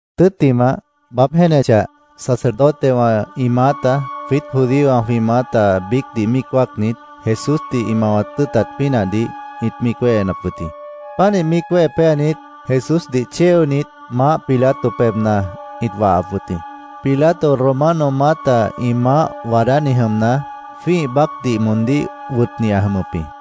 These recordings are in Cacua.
Tʉ́ttimah, baáb jéenechah, sacerdotewã ĩ maáta, jwiít judíowã jwĩ maáta biícdih míic wáacnit, Jesúsdih ĩ mawat tʉ́ʉtat pínahdih ĩt míic wéhenap wʉt jĩ. Pánih míic wéhe péanit, Jesúsdih chéonit, Maáh Pilato pebhna ĩt wahap wʉt jĩ. Pilato Romano maáta ĩ maáh waadáni jʉmna, jwĩ́ih baácdih moondíh wʉtni ã jʉmʉp jĩ.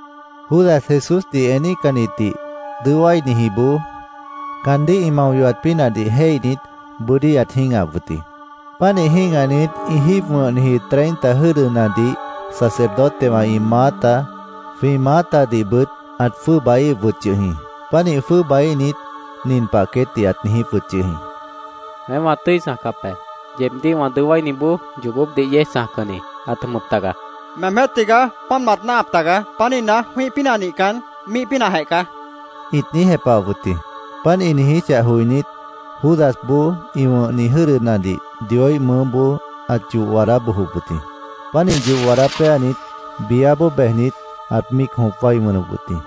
Judas, Jesúsdih eníhcannitdih dʉó wáinijiboó, caandíh ĩ mao yohat pínahdih jéihnit, bʉ́dí ãt jĩ́gahap wʉt jĩ. Pánih jĩ́gahnit, ĩ jíib wʉ̃hniji treinta jʉ́dʉnadih sacerdotewã ĩ maáta, jwĩ maátadihbʉt ãt jwʉ́ʉbaíhip wʉt yʉh jĩ. Pánih jwʉ́ʉbaíhnit, nin pah queétdih ãt niijíp wʉt yʉh jĩ: —Weém wã tʉ́i chãjcap be. Yeebdíh wã dʉó wáiniboó yoobópdih yéej chãjcanni ãt jʉmʉp taga, ãt niijíp wʉt jĩ. —Meemjéh tigaá páant mat náahap taga. Pánihna, jwĩ́ih pínah nihcan, míih pínahjeh caá, ĩt niíj jepahap wʉt jĩ. Páant ĩ niijíchah joinít, Judasboó ĩ wʉ̃hni jʉ́dʉnadih Dioíh mʉʉ́boó ãt yoh waadá bojop wʉt jĩ. Pánih yoh waadá péanit, biáboó bejnit, ãt míic jõp wái wʉnʉp wʉt jĩ.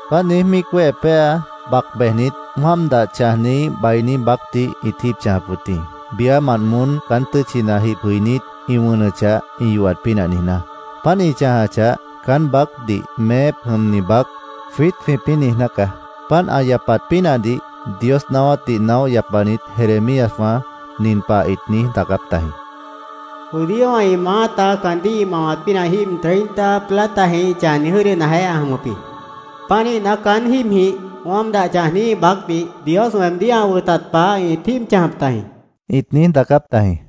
Páant niíj míic wéhe péa, bac bejnit, wáam dah chãjniíh bainí baácdih ĩt jíib chãjap wʉt jĩ, biámant moón caán tʉ́tchina jib jʉinít ĩ wʉnʉchah, ĩ yohat pínah niijná. Páant ĩ chãjachah, caán baácdih “Meép jʉmni baác”, jwiít jwĩpĩ́ niijná caá. Páant ã yapat pínahdih Dios naáwátdih naóh yapanit Jeremíaswã nin pah ĩt niíj daacáp tajĩ: “Judíowã ĩ maáta caandíh ĩ mawat pínah jíib treinta platajĩh ĩ chãjniji jʉ́dʉnajeh ã jʉmʉp jĩ. Pánihna, caán jíibjĩh wáam dah chãjniíh baácdih Dios weemdíh ã wʉtat pah ĩt jíib chãjap tajĩ”, ĩt niíj daacáp tajĩ.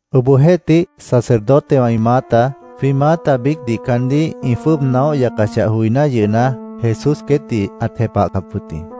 Obohjeéhtih, sacerdotewã ĩ maáta, jwĩ maáta biícdih caandíh ĩ jwʉ́ʉb naóh yacachah joiná yʉhna, Jesús queétdih ãt jepahcap wʉt jĩ.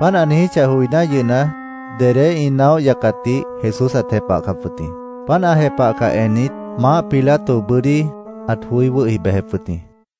Páant ã niijíchah joiná yʉhna, dedé ĩ naóh yacatdih Jesús ãt jepahcap wʉt jĩ. Páant ã jepahcah ennit, Maáh Pilato bʉ́dí ãt joí wʉ́hi bejep wʉt jĩ.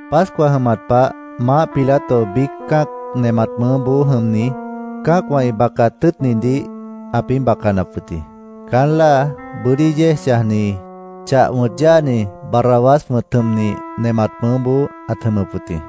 Pascua jʉmat pah Maáh Pilato biíc cã́ac nemat mʉʉ́boó jʉmni, cã́acwã ĩ bacaat tʉ́ʉtnidih ãpĩ́ bacanap wʉt jĩ. Caán láa bʉ́dí yéej chãjni, chah wʉ̃t yáani, Barrabás wʉ̃t jʉmni, nemat mʉʉ́boó ãt jʉmʉp wʉt jĩ.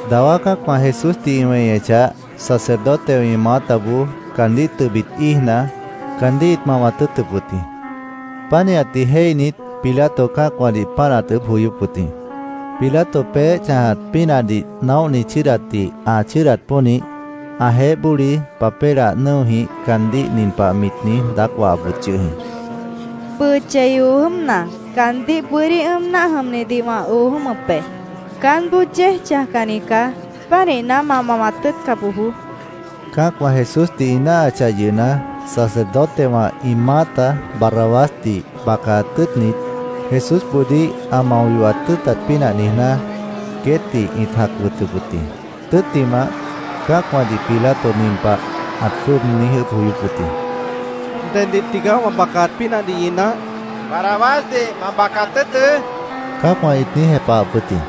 Dawá cã́acwã Jesúsdih ĩ weñechah, sacerdotewã ĩ maátaboó caandíh tʉbit íijna, caandíh ĩt mawat tʉ́ʉtʉp wʉt jĩ. Pánihatdih jéihnit, Pilato cã́acwãdih páant ãt ʉʉ́bh joyóp wʉt jĩ. Pilato peéh chãjat pínahdih naóhni chʉ́ʉdatdih ã chʉ́ʉdat pónih, ãjeéh bóli papélah nʉ́ojĩh caandíh nin pah mit niíj daác wahap wʉt yʉh jĩ: “Bʉʉ chei oo jʉ́mna, caandíh bʉ́dí ʉ́ʉm náah jʉmnidih wã oo jʉ́mʉp be. Caánboó yéej chãjcanni caá. Pánihna, ma mawat tʉ́ʉtca bojoó”, mit niijíp wʉt jĩ. Cã́acwã Jesúsdih ĩ náahachah yʉhna, sacerdotewã ĩ maáta Barrabásdih bacaat tʉ́ʉtnit, Jesúsboodíh ã mao yohat tʉ́ʉtat pínah niijná, queétdih ĩt jac wʉtʉp wʉt jĩ. Tʉ́ttimah, cã́acwãdih Pilato nin pah ãt jwʉ́ʉb niíj ʉʉ́bh joyóp wʉt jĩ: —¿Deddih tigaá wã bacaat pínahdih ñi náah? ãt niijíp wʉt jĩ. —¡Barrabásdih ma bacaat tʉ́ʉtʉ́! cã́acwã ĩt niíj jepahap wʉt jĩ.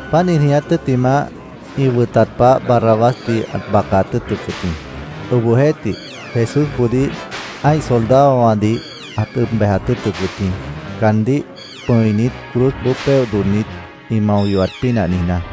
Páant ĩ niiját tʉ́ttimah, ĩ wʉtat pah Barrabásdih ãt bacaat tʉ́ʉtʉp wʉt jĩ. Obohjeéhtih, Jesúsboodíh ã́ih soldadowãdih ãt ʉb bejat tʉ́ʉtʉp wʉt jĩ, caandíh pʉ̃init, cruzboó péoh dodhnit, ĩ mao yohat pínah niijná.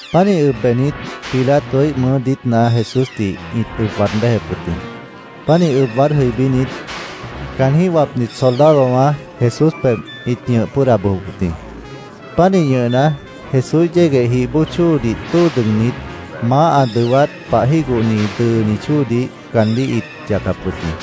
Pánih ʉb bejnit, Pilatoíh mʉʉ́ diítna Jesúsdih ĩt ʉb waad béjep wʉt jĩ. Pánih ʉb waad béjnit, caanjĩ́h wapnit soldadowã Jesús pebh ĩt ñʉh pʉ́ʉda bojop wʉt jĩ. Pánih ñʉhna, Jesúíh yégueh jih bóo chóodih tóo dʉgnit, maáh ã dʉwát pah jígohni dʉʉni chóodih caandíh ĩt yacap wʉt jĩ.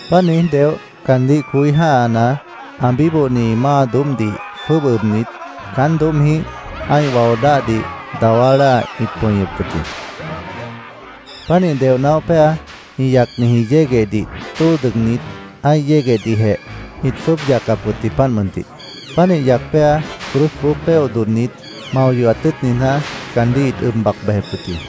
Páant niíj deoh, caandíh coí jã́hana, ã bíbohni máa doóbhdih jwʉ́ʉb ʉbnit, caán doóbhjĩh ã́ih wao dáhdih dawá láa ĩt pʉñʉp wʉt jĩ. Pánih deoh naóh péa, ĩ yacniji yéguehdih tóo dʉgnit, ã́ih yéguehdihjeh ĩt jwʉ́ʉb yacap wʉt jĩ, páant mʉntih. Pánih yac péa, cruzboó péoh dodhnit, mao yohat tʉ́ʉt niijná, caandíh ĩt ʉb bac bejep wʉt jĩ.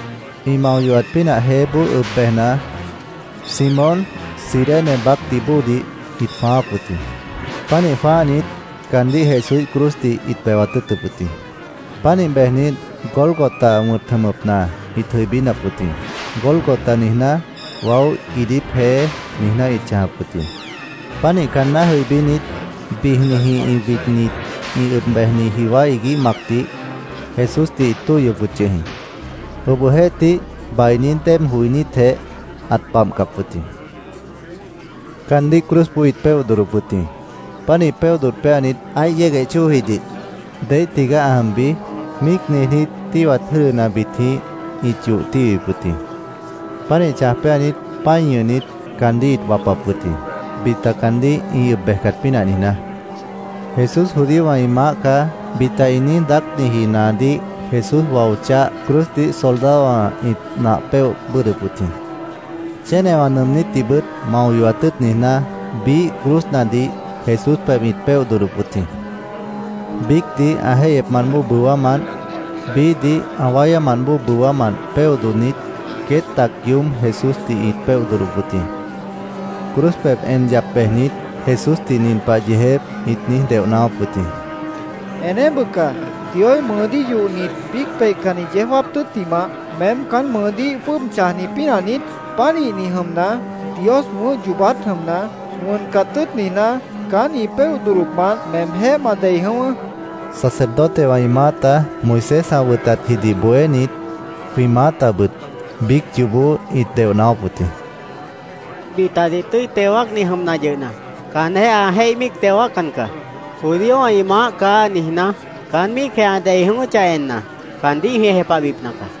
Ĩ mao yohat pínah jeéboó ʉb bejna, Simón, Cirene baácdih bóodih ĩt jwãááp wʉt jĩ. Pánih jwãáhnit, caandíh Jesúíh cruzdih ĩt bewat tʉ́ʉtʉp wʉt jĩ. Pánih bejnit, Gólgota wʉ̃t jʉmʉpna ĩt jʉibínap wʉt jĩ. “Gólgota”, niijná, “Waó iidíp jeé”, niijná ĩt chãjap wʉt jĩ. Pánih caanná jʉibínit, bijnijĩh widnit, ĩ ʉb bejni jiwá iguíh macdih Jesúsdih ĩt tóihyop wʉt yʉh jĩ. Obohjeéhtih, bainí déeb joinítjeh, ãt babhcap wʉt jĩ. Caandíh cruzboó ĩt péoh dodhdop wʉt jĩ. Pánih péoh dodh péanit, ã́ih yégueh chóojidih “¿Deíh tigaá ã jʉmbi?” míic niijnít, tíhwat jʉ́dʉnabitjĩh ĩt yoh tíhwip wʉt jĩ. Pánih chãj péanit, pã́i chʉ́ʉdnit, caandíh ĩt wapap wʉt jĩ, bita caandíh ĩ ʉb bejcat pínah niijná. “Jesús judíowã ĩ maáh caá”, bita ĩ niíj daácniji naadíh Jesús wao cháh cruzdih soldadowã ĩt nah péoh bʉ́ʉdhdʉp wʉt jĩ. Chénewã nʉʉmnítdihbʉt mao yohat tʉ́ʉt niijná, biíh cruznadih Jesús pebh ĩt péoh dodhdop wʉt jĩ. Biícdih ã jéihyepmant bóo bʉwámant, biíhdih ã wáyámant bóo bʉwámant péoh dodhnit, queét tac yoób Jesúsdih ĩt péoh dodhdop wʉt jĩ. Cruz pebh en yap bejnit, Jesúsdih nin pah yeejép ĩt niíj deoh naáwáp wʉt jĩ: —¡Eneéh bʉca! ¿Dioíh mʉʉdíh yohnit, biíc peihcanni yeó jáap tʉ́ttimah, meém caán mʉʉdíh jwʉ́ʉb chãjni pínah niít? Pánihni jʉmna, Dios wʉ̃ʉ́h yoobát jʉmna, wʉncat tʉ́ʉt niijná, caán ĩ péoh dodhdopmant meemjéh ma dei jʉ̃ʉ́wʉ́, ĩt niijíp wʉt jĩ. Sacerdotewã ĩ maáta, Moisés ã wʉtatjidih bohénit, jwĩ maátabʉt biíc yoobó ĩt deoh naáwáp wʉt jĩ. —Bitadih tʉ́i teo wáacni jʉmna yʉhna, caanjéh ã jéih míic teo wáaccan caá. ‘Judíowã ĩ maáh caá’, niijná, caán míicjeh ã dei jʉ̃ʉ́wʉ́chah enna, caandíh jwĩ jepahbipna caá.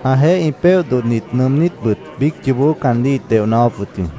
Ãjeéh ĩ péoh dodhnit nʉʉmnítbʉt biíc yoobó caandíh ĩt deoh naáwáp wʉt jĩ.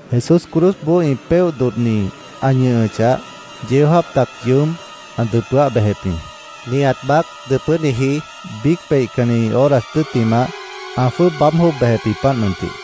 Jesús cruzboó ĩ péoh dodhni ã ñʉhʉchah, yeó jáap tac yoób ã dʉpʉ́áh bejep jĩ. Nihat baác dʉpʉ́niji, biíc peihcanni horas tʉ́ttimah, ã jwʉ́ʉb baáb jwʉ́ʉb bejep jĩ, páant mʉntih.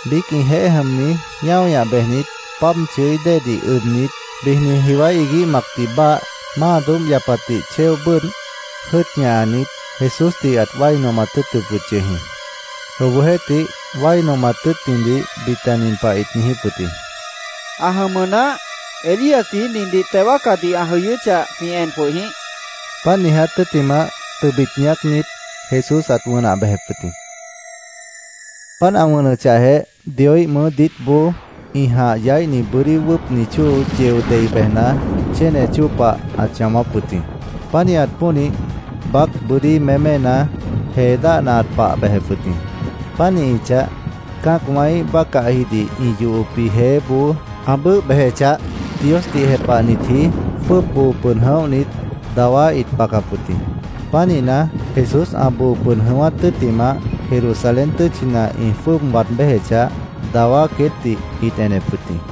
Biíc ĩjeéh jʉmni ñáo ñah bejnit, páab chʉí déedih ʉbnit, bijni jiwá iguíh macdih báah, máa doóbh yapatdih chéo bʉ́ʉdh, jʉ́ʉt ñahanit, Jesúsdih ãt wái nomat tʉ́ʉtʉp wʉt yʉh jĩ. Obohjeéhtih, wái nomat tʉ́ʉtnidih bita nin pah ĩt niijíp wʉt jĩ: —¡Ã jʉmʉ naáh! Elíasji nindih teo wáacadih ã jʉ̃ʉ́wʉ́chah, jwĩ en jwʉh jĩíh, ĩt niijíp wʉt jĩ. Páant ĩ niiját tʉ́ttimah, tʉbit ñaácnit, Jesús ãt wʉnah bejep wʉt jĩ. Páant ã wʉnʉchahjeh, Dioíh mʉʉ́ diítboó ĩ jãh yaíhni bʉ́dí wʉ́ʉpni chóo yeo dei bejna, chéne chóo pah ãt chãwáp wʉt jĩ. Pánihat pónih, baác bʉ́dí méména, jee dáhna ãt pah bejep wʉt jĩ. Pánihichah, cã́acwãíh bácahjidih ĩ yohopji jeéboó ã bʉ́ʉh bejechah, Diosdih jepahnitji jwʉ́ʉb boo pʉd jʉ̃óhnit, dawá ĩt bacap wʉt jĩ. Pánihna, Jesús ã boo pʉd jʉ̃ʉ́wát tʉ́ttimah, Jerusalén tʉ́tchina ĩ jwʉ́ʉb waad béjechah, dawá queétdih ĩt enep wʉt jĩ.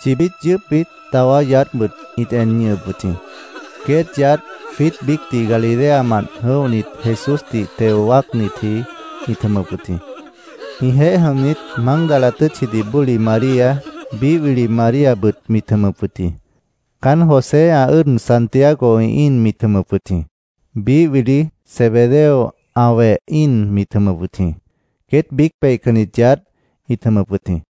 Chibít yʉʉ́pbit dawá yaádhbʉt ĩt en ñʉhʉp wʉt jĩ. Queét yaádh jwiít biícdih Galileamant jʉ̃óhnit, Jesúsdih teo wáacnitji ĩt jʉmʉp wʉt jĩ. Ĩjeéh jʉmnit, Mágdala tʉ́tchidih bóli María, biíh wili Maríabʉt mit jʉmʉp wʉt jĩ. Caánt José, ã ʉ́ʉd Santiago ĩ íin mit jʉmʉp wʉt jĩ. Biíh wili Zebedeo ã weh íin mit jʉmʉp wʉt jĩ. Queét biíc peihcannit yaádh ĩt jʉmʉp wʉt jĩ.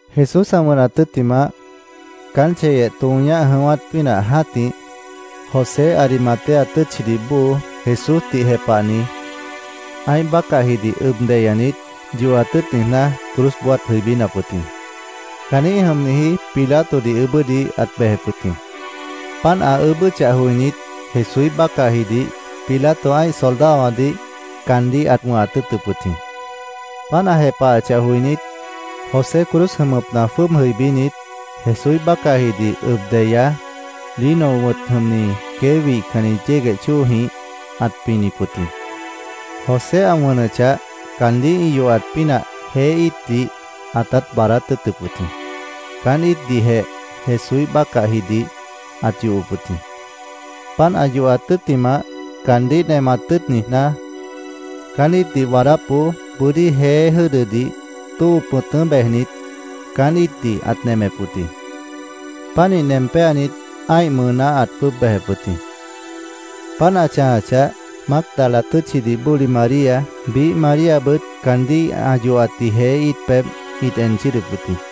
Jesús ã wʉnat tʉ́ttimah, caan chéyeh tõo ñáh jʉ̃ʉ́wát pínah jã́tih, José, Arimatea tʉ́tchidih bóo, Jesúsdih jepahni, ã́ih bácahjidih ʉb deyanit, yohat tʉ́ʉt niijná, cruzboó ãt jʉibínap wʉt jĩ. Caanjĩ́h jʉmniji Pilatodih ʉʉ́bʉ́dih ãt bejep wʉt jĩ. Páant ã ʉʉ́bʉ́chah joinít, Jesúíh bácahjidih Pilato ã́ih soldadowãdih caandíh ãt wʉ̃hat tʉ́ʉtʉp wʉt jĩ. Páant ã jepahachah joinít, José cruz jʉmʉpna jwʉ́ʉb jʉibínit, Jesúíh bácahjidih ʉb deya, lino wʉ̃t jʉmni quei wíhcanni yégueh chóojĩh ãt pinip wʉt jĩ. José ã wʉnʉchah, caandíh ĩ yohat pínah jeé íitdih ãtát baadát tʉ́ʉtʉp wʉt jĩ. Caán íitdihjeh Jesúíh bácahjidih ãt yohop wʉt jĩ. Páant ã yohat tʉ́ttimah, caandíh nemat tʉ́ʉt niijná, caán íitdih waadápboó bʉ́dí jeé jʉ́dʉdih tóo pʉ̃tʉ́ bejnit, caán íitdih ãt nemep wʉt jĩ. Pánih nem péanit, ã́ih mʉʉná ãt jwʉ́ʉb bejep wʉt jĩ. Páant ã chãjachah, Mágdala tʉ́tchidih bóli María, biíh Maríabʉt caandíh ã yohatji jeé íit pebh ĩt en chʉ́ʉdʉp wʉt jĩ.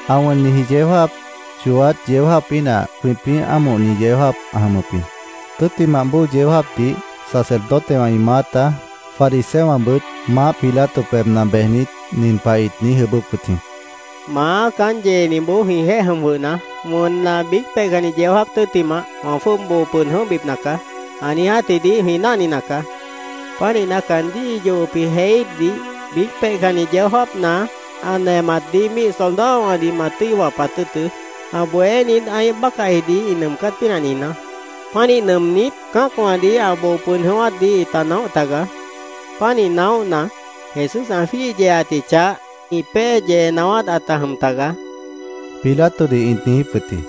Ã wʉnniji yeó jáap, chooát yeó jáap pínah jwĩpĩ́ ámohni yeó jáap ã jʉmʉp jĩ. Tʉ́ttimah bóo yeó jáapdih sacerdotewã ĩ maáta, fariseowãbʉt Maáh Pilato pebhna bejnit, nin pah ĩt niíj ʉʉ́bʉ́p wʉt jĩ: —Maá, caán yeeniboó jwĩjeéh jʉm jwʉhna, ‘Wʉnna, biíc peihcanni yeó jáap tʉ́ttimah wã jwʉ́ʉb boo pʉd jʉ̃óhbipna caá’, ã niijátjidih jwĩ náhnina caá. Pánihna, caandíh ĩ yohopji jeé íitdih biíc peihcanni yeó jáapna ã nematdih míih soldadowãdih ma tʉ́i wapat tʉ́ʉtʉ́, ã bohénit ã́ih bácahjidih ĩ nʉʉmcát pínah niijná. Pánih nʉʉmnít, cã́acwãdih ã boo pʉd jʉ̃ʉ́wátdih ĩta naóh tagaá. Pánih naóhna, Jesús ã jwíih yeeatji chah ĩ pée yee naáwát ãta jʉm tagaá, Pilatodih ĩt niijíp wʉt jĩ.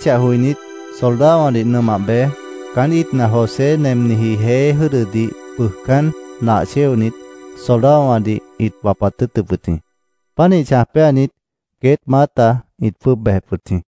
Páant ã niijíchah joinít, soldadowãdih nʉmah bej, caán íitdih José ã nemniji jeé jʉ́dʉdih bʉʉjcán nah chéonit, soldadowãdih ĩt wapat tʉ́ʉtʉp wʉt jĩ. Pánih chãj péanit, queét maáta ĩt jwʉ́ʉb bejep wʉt jĩ.